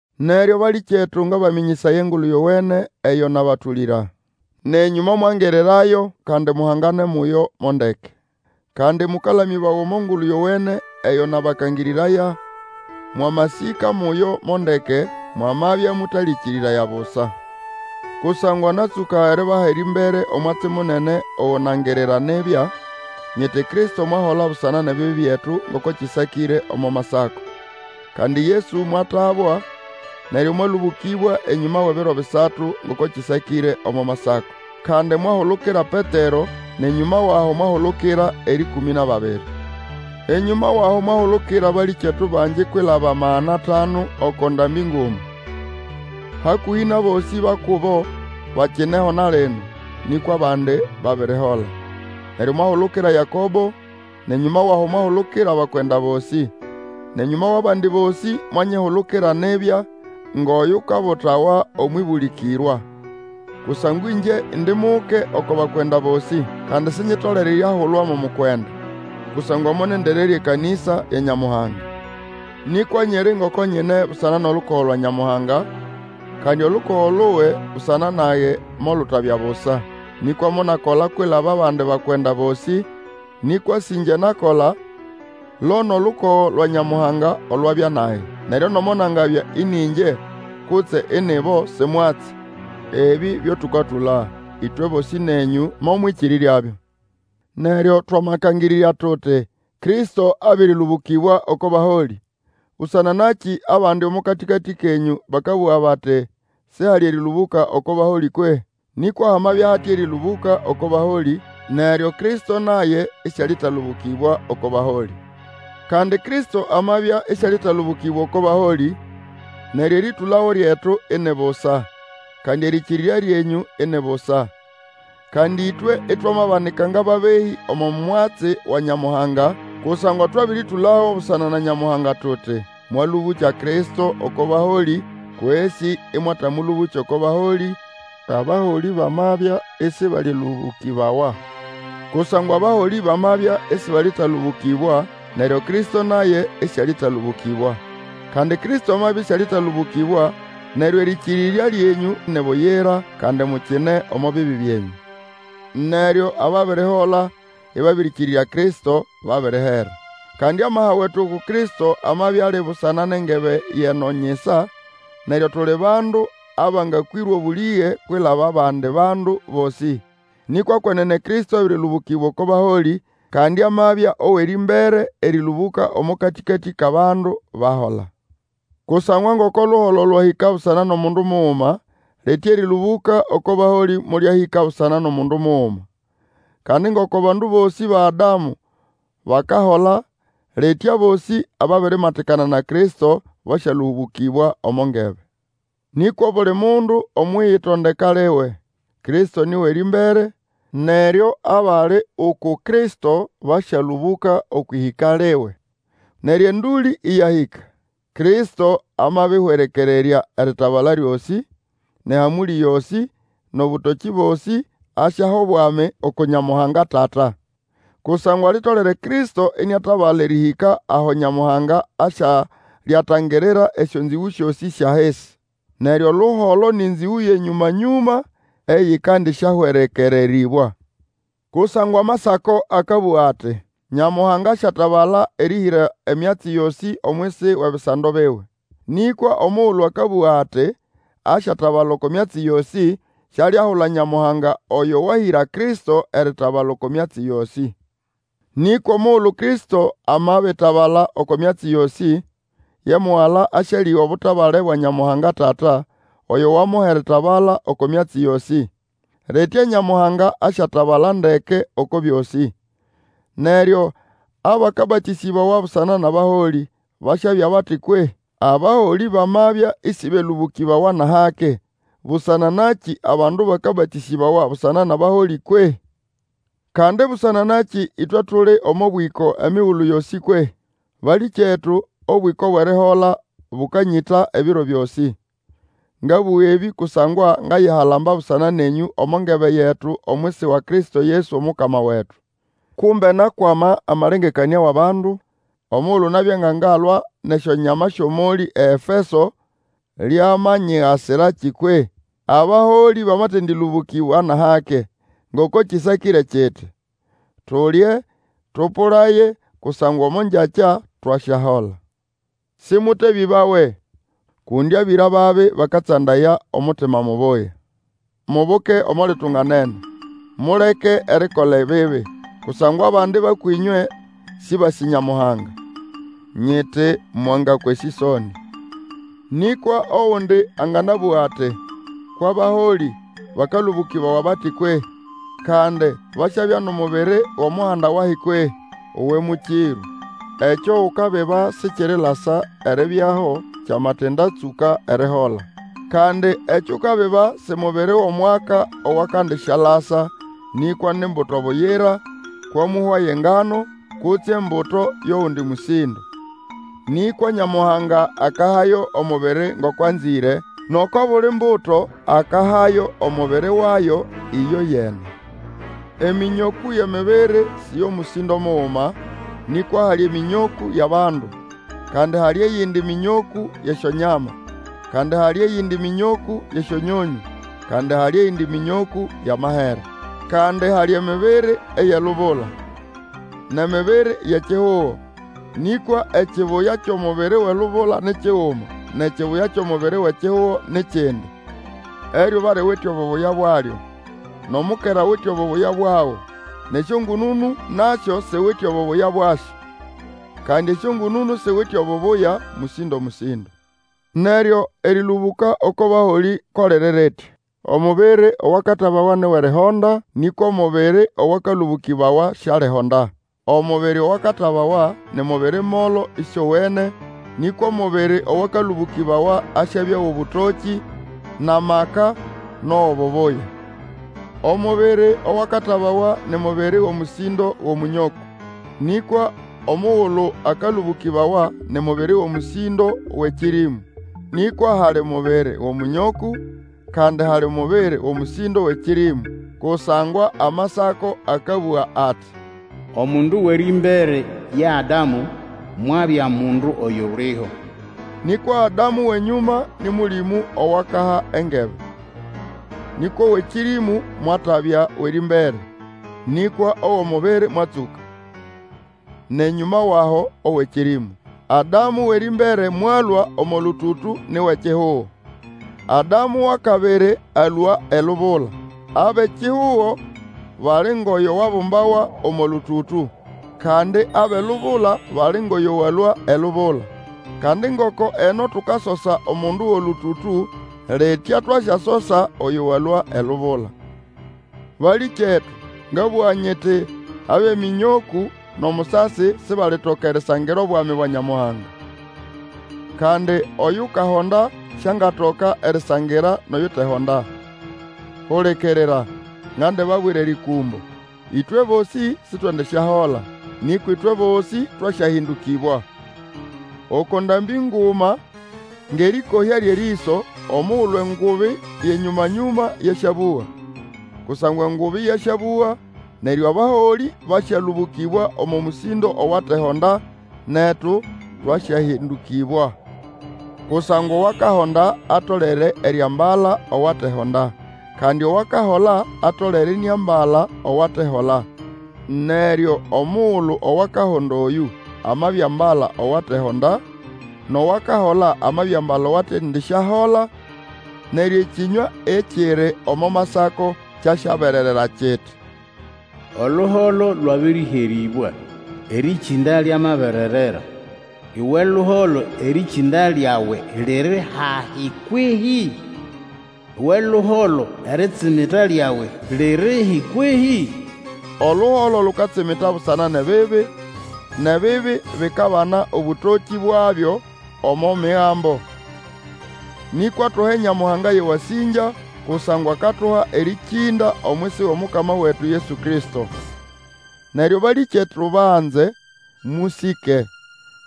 Neryo balĩkyetu, ngabamĩnyĩsaya Engulu Yowene eyo nabatũlĩra. Nenyũ momwangirirayo, kandi muhangane muyo mo ndeke. Kandi mũkalamĩbawa omo Ngulu Yowene eyo nabakangĩrĩraya, mwamasĩka muyo mo ndeke, mwamabya mũtalĩkĩrĩraya busa. Kusangwa natsũka eribaha erĩmbere omwatsi munene ogo nangirira nibya, nyiti Kristo mwahola busana nʼebibi byetu ngoko kĩsakĩre omo Masako, kandi Yesu mwatabwa, neryo mwalũbũkĩbwa enyũma wʼebiro bisatu ngoko kĩsakĩre omo Masako. Kandi mwahulukira Petero, nʼenyũma wʼaho mwahulukira erĩkũmĩ nʼababiri. Enyũma wʼaho mwahulukira abalĩkyetu bangi kwilaba magana atanu oko ndambĩ nguma. Hakũhĩ nʼabosĩ ba kubo bakineho na lino, nĩkwa abandi babirihola. Neryo mwahulukira Yakobo, nʼenyũma wʼaho mwahulukira abakwenda bosĩ; nʼenyũma wʼabandi bosĩ mwanyihulukira nibya, ngʼoyukabutawa omwʼĩbũlĩkĩrwa. Kusangwa ĩngye indi muke oko bakwenda bosĩ, kandi sinyitolere eriahulwa mo mukwenda, kusangwa monendererya ekanĩsa ya Nyamuhanga. Nĩkwa nyiri ngoko nyine busana nʼolukogo lwa Nyamuhanga, kandi olukogo luwe busana nage molutabya busa. Nĩkwa monakola kwilaba abandi bakwenda bosĩ, nĩkwa sĩ ĩngye nakola, lo nʼolukogo lwa Nyamuhanga olwabya nage. Neryo nomo nagabya ĩnĩ ĩngye kutse ini ibo, si mwatsi, ebĩ byo tũkatũla, ĩtwe bosĩ nenyũ momwĩkĩrĩryabyo. Neryo twamakangĩrĩrya tuti, Kristo abĩrĩlũbũkĩbwa oko baholĩ, busana nakĩ abandi omo katĩkatĩ kenyũ bakabũga bati, sihali erĩlũbũka oko baholĩ kwehĩ? Nĩkwa hamabya hate erĩlũbũka oko baholĩ, neryo Kristo naye ĩsĩalĩtalũbũkĩbwa oko baholĩ. Kandi Kristo amabya ĩsĩalĩtalũbũkĩbwa oko baholĩ, neryo erĩtũlago lyetu ini busa, kandi erĩkĩrĩrya lyenyũ ini busa. Kandi ĩtwe itwamabanika ngʼababehĩ omo mwatsi wa Nyamuhanga, kusangwa twabĩrĩtũlago busana na Nyamuhanga tuti, Mwalũbũkya Kristo oko baholĩ kwesĩ ĩmwatamũlũbũkya oko baholĩ, abaholĩ bamabya ĩsĩbalĩlũbũkĩbawa. Kusangwa abaholĩ bamabya ĩsĩbalĩlũbũkĩbawa, neryo Kristo naye ĩsĩalĩtalũbũkĩbwa. Kandi Kristo amabya ĩsĩalĩtalũbũkibwa neryo erĩkĩrĩrya lyenyũ ni buyira, kandi mukine omo bibi byenyũ. Neryo ababirihola ĩbabĩrĩkĩrĩrya Kristo, babirihera. Kandi amaha wetu uku Kristo amabya ali busana nʼengebe yʼeno nyisa, neryo tuli bandu abangakwĩrwa obũlĩge kwilaba abandi bandu bosĩ. Nĩkwa kwenene Kristo abĩrĩlũbũkĩbwa oko baholĩ, kandi amabya owʼerĩmbere erĩlũbũka omo katĩkatĩ kʼabandu bahola. Kusangwa ngoko luholo lwahĩka busana nʼomundu muguma, litya erĩlũbũka oko baholĩ molyahĩka busana nʼomundu muguma. Kandi ngoko abandu bosĩ ba Adamu bakahola, litya abosĩ ababirimatikana na Kristo basyalũbũkĩbwa omo ngebe. Nĩkwa obuli mundu omwʼiyitondeka liwe. Kristo nĩ wʼerĩmbere, neryo abali uku Kristo basyalũbũka okwʼĩhĩka liwe. Neryo endũlĩ ĩyahĩka; Kristo amabĩhwerekererya eritabala lyosĩ, nʼehamũlĩ yosĩ, nʼobũtokĩ bosĩ, asyaha obwami uku Nyamuhanga Tata. Kusangwa litolere Kristo iniatabala erĩhĩka aho Nyamuhanga asyalyatangirira esyonzĩgũ syosĩ syʼahisi. Neryo oluholo nĩ nzĩgũ yʼenyũma-nyũma eyikandisyahwerekererĩbwa. Kusangwa Amasako akabũga ati, Nyamuhanga asyatabala erĩhĩra emyatsi yosĩ omwisi wʼebisando biwe. Nĩkwa omugulu akabũga ati asyatabala oko myatsi yosĩ, sialiahula Nyamuhanga oyo wahĩra Kristo eritabala oko myatsi yosĩ. Nĩkwa omugulu Kristo amabitabala oko myatsi yosĩ, ye Mugala asyalĩga obutabale bwa Nyamuhanga Tata, oyo wamuha eritabala oko myatsi yosĩ. Litya Nyamuhanga asyatabala ndeke oko byosĩ. Neryo abakabatĩsĩbawa busana nʼabaholĩ basyabya bati kwehĩ? Abaholĩ bamabya ĩsĩbelũbũkĩbawa nʼahake, busana nakĩ abandu bakabatĩsĩbawa busana nʼabaholĩ kwehĩ? Kandi busana nakĩ ĩtwe tuli omo bwĩko emigulu yosĩ kwehĩ? Balĩkyetu, obwĩko bwʼerihola bũkanyĩta ebiro byosĩ. Ngabũga ebĩ kusangwa ngayihalamba busana nenyũ omo ngebe yetu omwisi wa Kristo Yesu Omukama wetu. Kumbe nakwama amalengekanĩa wʼabandu omugulu nabya nga ngalwa nʼesyonyama syʼomolĩ eEfeso, lyamanyigasirakĩ kwehĩ? Abaholĩ bamatendĩlũbũkĩbwa nʼahake, ngoko kĩsakĩre kiti, Tulye, tũpũlaye, kusangwa omo ngyakya twasyahola. Sĩmũtebĩbawe, kundi abĩra babi bakatsandaya omutima mubuya. Mubuke omo litunganene, muleke erikola ebibi. Kusangwa abandi ba kwĩnywe sĩbasĩ Nyamuhanga. Nyiti, mwangakwa esĩsonĩ. Nĩkwa ogundi anganabũga ati, Kwʼabaholĩ bakalũbũkĩbawa bati kwehĩ? Kandi basyabya nʼomubiri wʼomuhanda wahi kwehĩ? Uwe mũkĩrũ! Ekyo ukabiba sikirilasa eribyaho kyamatindatsũka erihola. Kandi ekyo Ukabiba si mubiri wʼomwaka owakandisyalasa, nĩkwa ni mbuto buyira, kwamũhwa ye ngano, kutse embuto yʼogundi mũsĩndo. Nĩkwa Nyamuhanga akahayo omubiri ngoko anzĩre, nʼoko buli mbuto akahayo omubiri wayo ĩyoyene. Emĩnyokũ yʼemibiri sĩ yʼomũsĩndo muguma, nĩkwa hali emĩnyokũ yʼabandu, kandi hali eyindi mĩnyokũ yʼesyonyama, kandi hali eyindi mĩnyokũ yʼesyonyonyũ, kandi hali eyindi mĩnyokũ yʼamahere. Kandi hali emibiri eyʼelubula, nʼemibiri yʼekihugo, nĩkwa ekibuya kyʼomubiri wʼelubula ni kiguma, nʼekibuya kyʼomubiri wʼekihugo ni kindi. Eryuba liwite obubuya bwalyo, nʼomukera awite obubuya bwago, nʼesyongũnũnũ nasyo siwite obubuya bwasyo. Kandi esyongũnũnũ siwite obubuya mũsĩndo-mũsĩndo. Neryo erĩlũbũka oko baholĩ ko liri ritya. Omubiri owakatabawa ni wʼerihonda, nĩkwa omubiri owakalũbũkĩbawa sialihonda. Omubiri owakatabawa ni mubiri molo ĩsĩowene, nĩkwa omubiri owakalũbũkĩbawa asyabya wʼobũtokĩ, nʼamaka nʼowʼobubuya. Omubiri owakatabawa ni mubiri wʼomũsĩndo wʼomũnyokũ; nĩkwa omugulu akalũbũkĩbawa ni mubiri wʼomũsĩndo wʼekĩrĩmũ. Nĩkwa hali mubiri wʼomũnyokũ, kandi hali mubiri wʼomũsĩndo wʼekĩrĩmũ. Kusangwa Amasako akabũga ati, Omundu wʼerĩmbere ye Adamu, mwabya mundu oyuliho. Nĩkwa Adamu wʼenyũma nĩ Mũlĩmũ owakaha engebe. Nĩkwa owʼekĩrĩmũ mwatabya wʼerĩmbere, nĩkwa owʼomubiri mwatsũka, nʼenyũma wʼaho owʼekĩrĩmũ. Adamu wʼerĩmbere mwalũa omo lũtũtũ, ni wʼekihugo. Adamu wʼakabiri alũa elubula. Abʼekihugo bali ngʼoyo wabumbawa omo lũtũtũ; kandi abʼelubula bali ngʼoyo walũa elubula. Kandi ngoko eno tukasosa omundu wʼolũtũtũ, litya twasyasosa oyo walũa elubula. Balĩkyetu, ngabũga nyiti, abʼemĩnyokũ nʼomusasi sibalitoka erisangira Obwami bwa Nyamuhanga; kandi oyukahonda siangatoka erisangira nʼoyutehonda. Hulikirira, ngandibabwira erĩkũmbo; ĩtwe bosĩ Sitwendisyahola, nĩkwa ĩtwe bosĩ twasyahĩndũkĩbwa, oko ndambĩ nguma ngʼerĩkohya lyʼerĩso, omugulu engubi yʼenyũma-nyũma yasyabũga. Kusangwa engubi yasyabũga, neryo abaholĩ basyalũbũkĩbwa omo mũsĩndo owatehonda, netu twasyahĩndũkĩbwa. Kusangwa owakahonda atolere eriambala owatehonda, kandi owakahola atolere iniambala owatehola. Neryo omugulu owakahonda oyũ, amabiambala owatehonda, nʼowakahola amabiambala owatendisyahola, neryo ekĩnywa ekiri omo Masako kyasyabererera kiti, Oluholo lwabĩrĩherĩbwa, Erĩkĩnda lyamabererera! Uwe luholo, erĩkĩnda lyawe liri hahi kwehĩ? Uwe luholo, eritsimita lyawe lirihi kwehĩ? Oluholo lukatsimita busana nʼebibi, nʼebibi bikabana obũtokĩ bwabyo omo Migambo Nĩkwa tuhe Nyamuhanga yʼewasĩngya, kusangwa akatuha erĩkĩnda omwisi wʼOmukama wetu Yesu Kristo. Neryo balĩkyetu banze, mũsĩke,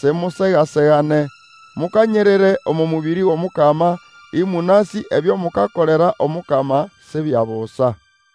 simusega-segane, mukanyirire omo mũbĩrĩ wʼOmukama, ĩmũnasĩ ebyo mukakolera Omukama si bya busa.